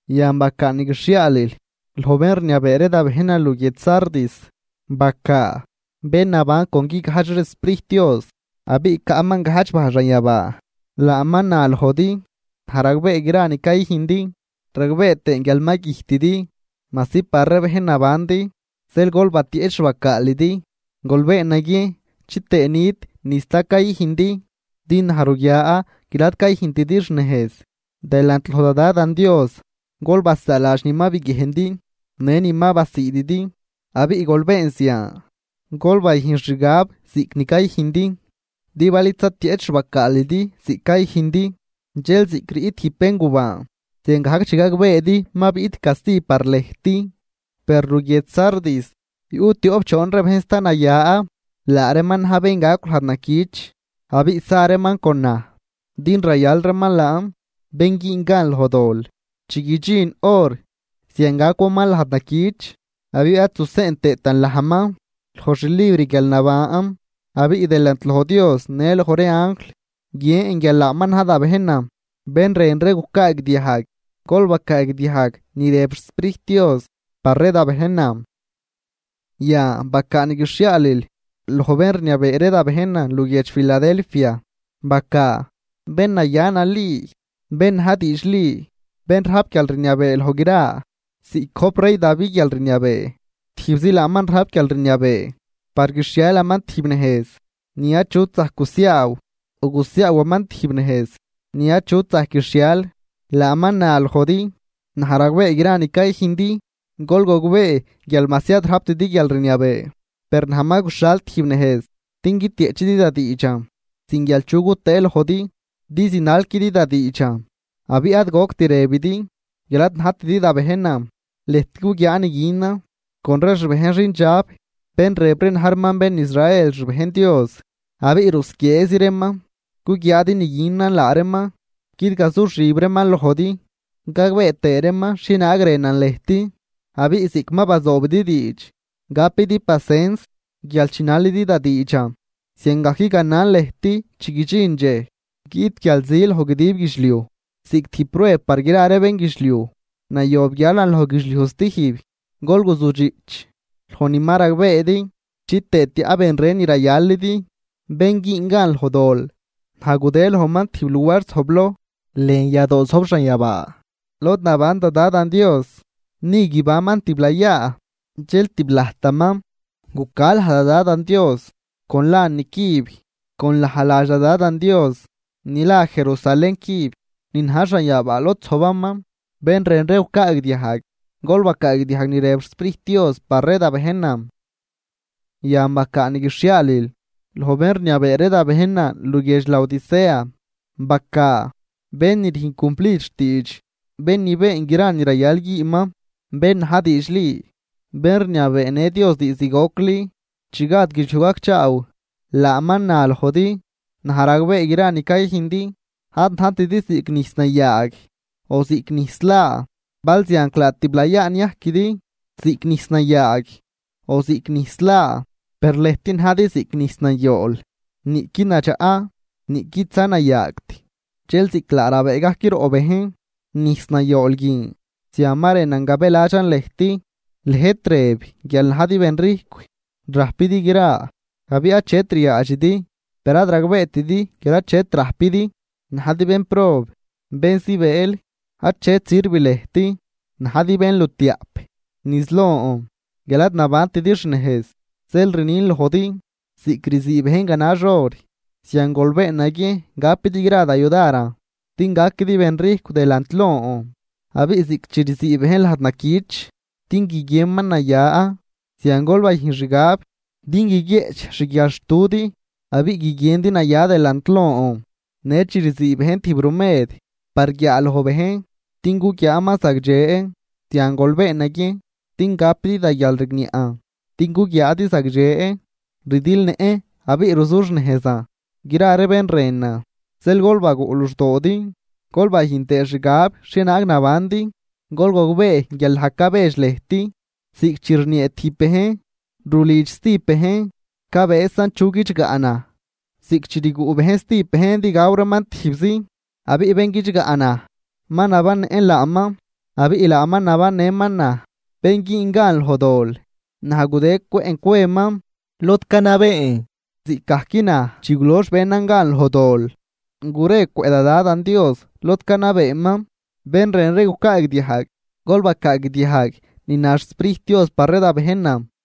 ’Yan bacaa ni guixhiaalil loj bén rniabee ree da bejnan luguiedx Sardis. Bacaa: “Bén naban con guigajdx ree xSprijt Dios abiꞌ caꞌman gajdx bajl xanyabaa, laaman na lojdi: Naj ragbee gra ni cayüjndi ragbee tëën guial ma güjtidi, majsi par ree bejn nabandi. Zeel gol batieꞌch xbacaalidi, gol been naguiejn chitëë nit ni sta cayüjndi, din naj ruguian guial ad cayüjntidi xnejz delant loj da Dadan Dios. Gol basaaladx ni ma biguiejndi në ni ma basiididi, abiꞌ gol been zian, gol bayüjn xgab ziꞌc ni cayüjndi. Din bal id zatieꞌch xbacaalidi ziꞌc cayüjndi, dxel ziꞌc riꞌt tijb béngubaan ziangajc chi gagbeedi ma biꞌt casti par lëjt. Per luguiedx Sardis, yuꞌ tioꞌp choon ree bejn sta naya, laa reeman na̱j bén gacw lajd naquich abiꞌ sa reeman con naj, din rayal reeman laan. Bén güün gan loj dol, chi guidxin hor, zian gacwaman lajd naquich abiꞌ ad zuseꞌn tëëtan lajman loj xlibr guialnaban. Abiꞌ delant loj Dios në loj ree anjl guien guial laaman na̱j da bejnan. Bén rën ree gucaagdiajg, gol bacaadiajg ni rëb xSprijt Dios par ree da bejnan.” ’Yan bacaa ni guixhiaalil loj bén rniabee ree da bejnan luguiedx Filadelfia. Bacaa: “Bén naya nali, bén na̱j diidxli, bén rajp guialrniabee loj gra ziꞌc gojp rey Davi guialrniabee, tijbzi laaman rajp guialrniabee par guixhialaman tijb nejz ni achut zajc gusiaaw o gusiaawaman tijb nejz ni achut zajc guixhial, laaman na lojdi: Naj ragbee gra ni cayüjndi. Gol gogbee guial majsi ad rajptidi guialrniabee, per naj ma guxhal tijb nejz din guitieꞌchidi da diidxan sin guial chu gutëë lojdi, din zinalquidi da diidxan abiꞌ ad goct rëbidi guial ad najtidi da bejnan. Lëjt guguiaa ni günan con ree xbejn xindxab bén rëb ree na̱j reeman bén Israel xbejn Dios, abiꞌ rusquieezi reeman. Guguiaadi ni günan laa reeman, guidgazuxib reeman lojdi, gagbee tëë reeman xhienaag rënan lëjt. Abiꞌ ziꞌc ma bazoobidi diidx gapidi pacens guial chinalidi da diidxan, ziangajc ganan lëjt chi guidxin dxej guiꞌt guialzi loj guidib guidxliuj, ziꞌc tijb prueb par gra ree bénguidxliuj. Nayob guialan loj guidxliuj stijb. Gol guzujdxiꞌch loj ni ma ragbeedi chitëë tiaꞌ ben ren ni rayalidi. Bén güün gan loj dol, naj gudë lojman tijb luar zojbloj lën yadoo zojb xanyabaa lod naban da Dadan Dios, ni guibanman tiblayaa. Dxel tiblajtaman guca laj da Dadan Dios con lan nicüb, con laj ladx da Dadan Dios ni la Jerusalén cüb ni na̱j xanyabaa lod zojbaman. Bén rën ree gucaagdiajg, gol bacaagdiajg ni rëb xSprijt Dios par ree da bejnan.” ’Yan bacaa ni guixhiaalil loj bén rniabee ree da bejnan luguiedx Laodicea. Bacaa: “Bén ni rüjn cumplid xtiidx, bén ni been gra ni rayal güünman, bén na̱j diidxli, bén rniabeenë Dios diizd gocli chi gad guidxliuj gacchaaw, laaman na lojdi: Naj ragbee gra ni cayüjndi. Ad najtidi ziꞌc nijs nayaag o ziꞌc nijs laa. ¡Balzianclaa tiblayaa niajquidi ziꞌc nijs nayaag o ziꞌc nijs laa! Per lëjt najdi ziꞌc nijs nayool, niꞌqui nadxaꞌ niꞌquidza nayaagt, dxel ziꞌc laa rabëë gajc roꞌ bejn nijs nayool guin, zian ma rënan gabëladxan lëjt. Lëjt rëb guial najdi benrijcw, rajpidi gra abiꞌ achet ryaadxidi. Per ad ragbeetidi guial achet rajpidi, najdi bénprob, bén zibëël, achet sirv lëjt, najdi bénlutiaꞌp niz lon guial ad nabantidi xnejz. Zeel rnin lojdi, ziꞌc rzii bejn ganax or, zian gol been naguiejn gapidi gra da yudaran, din gaquidi rijcw delant lon. Abiꞌ ziꞌc chi rzii bejn lajd naquich din guiguienman naya, zian gol bayüjn xgab din guiguieꞌch xguialxtudi abiꞌ guiguiendi naya delant lon. Në chi rzii bejn tijb rumed par guiaaloj bejn din guguiaaman zagdxe, zian gol been naguiejn din gapidi da guial rigniaꞌn din guguiaadi zagdxe. Rdilnëꞌn abiꞌ ruzuxnejzan gra ree bén rënan. Zeel gol baguꞌ luxdoodi gol bayüjn tëë xgab xhienaag nabandi. Gol gogbee guial naj cabedx lëjt, ziꞌc chi rniee tijb bejn rulidx stijb bejn. Cabëësan chu guidxgaꞌ naj, ziꞌc chi rguꞌ bejn stijb bejn din gaw reeman tijbzi. Abiꞌ bén guidxgaꞌ naj ma nabannëꞌn laaman abiꞌ laaman nabannëman naj. Bén güün gan loj dol naj gudë cwëꞌn cweman lod canabeen, ziꞌcgajc naj chi gulox benan gan loj dol, gure cwëꞌ da Dadan Dios lod canabeeman. Bén rën ree gucaagdiajg, gol bacaagdiajg ni na xSprijt Dios par ree da bejnan.”